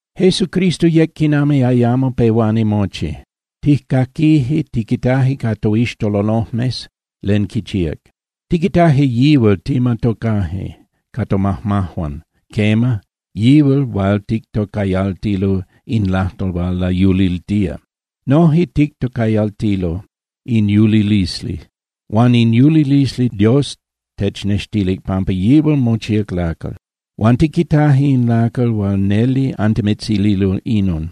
Jesucristo yec quiman ayamo pehuani mochi. Tijcaquije, tiquitaje ca toixtololojmes len quichíac. Tiquitaje yihual, ticmatocaje ca tomajmajuan, quema, yihual hual tictocayaltilo “In lajtol hual layuliltía”. Noje tictocayaltilo “In yulilisli”. Huan in yulilisli Dios technextilic, pampa yihual mochíac lacal. Huan tiquitaje in lacal huan neli antimitzililo inon.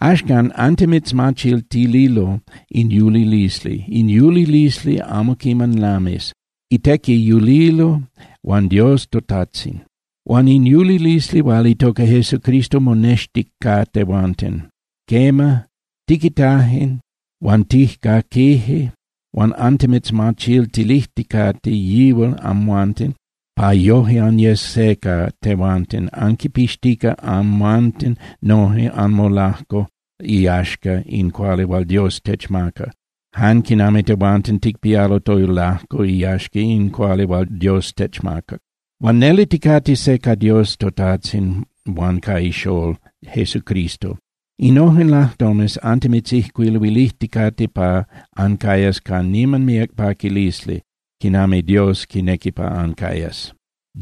Axcan antimitzmachiltililo in yulilisli. In yulilisli amo quiman lamis, itequi yulilo huan Dios toTajtzin. Huan in yulilisli hual itoca Jesucristo monextic ca tehuanten. Quema, tiquitaje huan tijcaquije, huan antimitzmachiltilijticate yihual amhuanten pa yoje anyes se ca tehuanten, anquipixtica amhuanten noje anmolajco iyaxca in cuali hual Dios techmaca, jan quinami tehuanten ticpialo tolajco iyaxca in cuali hual Dios techmaca. Huan neli ticate se ca Dios toTajtzin huan ca ixolol Jesucristo. Innojen lajtomes antimitzijcuiluilijticate pa ancayas ca niman míac paquilisli quinami Dios quinequi pa ancayas.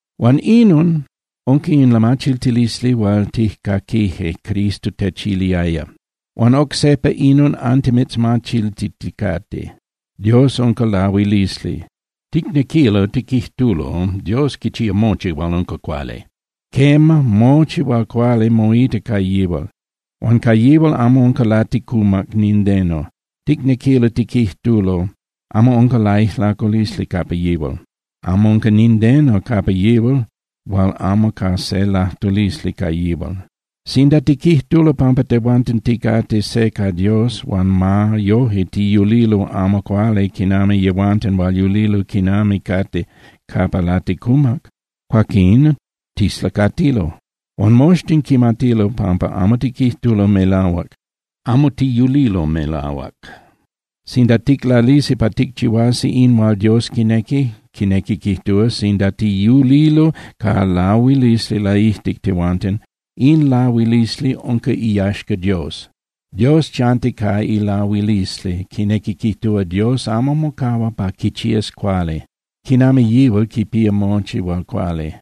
Huan inon unca in lamachiltilisli hual tijcaquije Cristo techiliaya. Huan oc sejpa inon antimitzmachiltiticate. Dios unca lahuilisli. Ticnequilo tiquijtulo, Dios quichía mochi hual unca cuali. Quema, mochi hual cuali moita ca yihual. Huan ca yihual amo unca laticumac nindeno, ticnequilo tiquijtulo, amo unca laijlaculisli capa yihual, amo unca nindeno capa yihual hual amo ca se lajtulisli ca yihual. Sinda tiquijtulo pampa tehuanten ticate se ca Dios huan ma yoje tiyulilo amo cuali quinami yehuanten hual yulilo quinami cate capa laticumac, cuaquín tislacatilo. Huan moxtin quimatilo pampa amo tiquijtulo melahuac, amo tiyulilo melahuac. Sinda ticlalisi pa ticchihuasi in hual Dios quinequi, quinequi quijtúa, sinda tiyulilo ca lahuilisli laijtic tehuanten, in lahuilisli unca iyaxca Dios. Dios chanti ca ilahuilisli, quinequi quijtúa, Dios amo mocahua pa quichías cuali, quinami yihual quipía mochi hual cuali.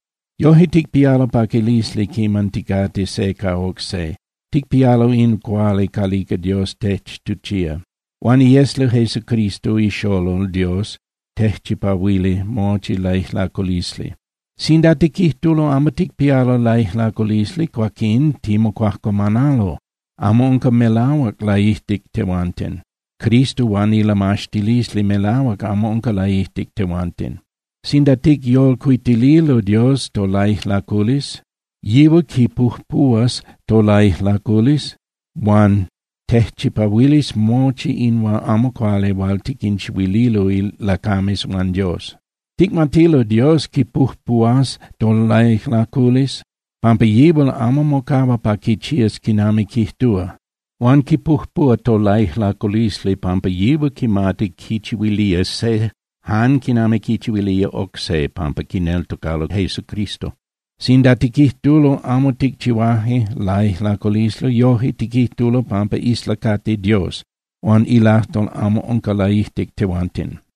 Yoje, ticpialo paquilisli quiman ticate se ca oc se, ticpialo in cuali calica Dios techtuchía. Huan iesli Jesucristo iXolol Dios tejchipahuilía mochi laijlaculisli. Sinda tiquijtulo amo ticpialo laijlaculisli, cuaquín timocuajcuamanalo. Amo unca melahuac laijtic tehuanten, Cristo huan ilamaxtilisli melahuac amo unca laijtic tehuanten. Sinda ticyolcuitililo Dios tolaijlaculisli, yihual quipujpuhuas tolaijlaculisli huan tejchipahuilis mochi in amo cuali hual tiquinchihuililo lacames huan Dios. Ticmatilo Dios quipujpuhuas tolaijlaculisli, pampa yihual amo mocahua pa quichías quinami quijtúa. Huan quipujpuhua tolaijlaculisli pampa yihual quimati quichihuilía se jan quinami quichihuilía oc se pampa quineltocalo Jesucristo. Sinda tiquijtulo amo ticchihuaje laijlaculisli, yojque tiquijtulo pampa islacati Dios, huan ilajtol amo unca laijtic tehuanten.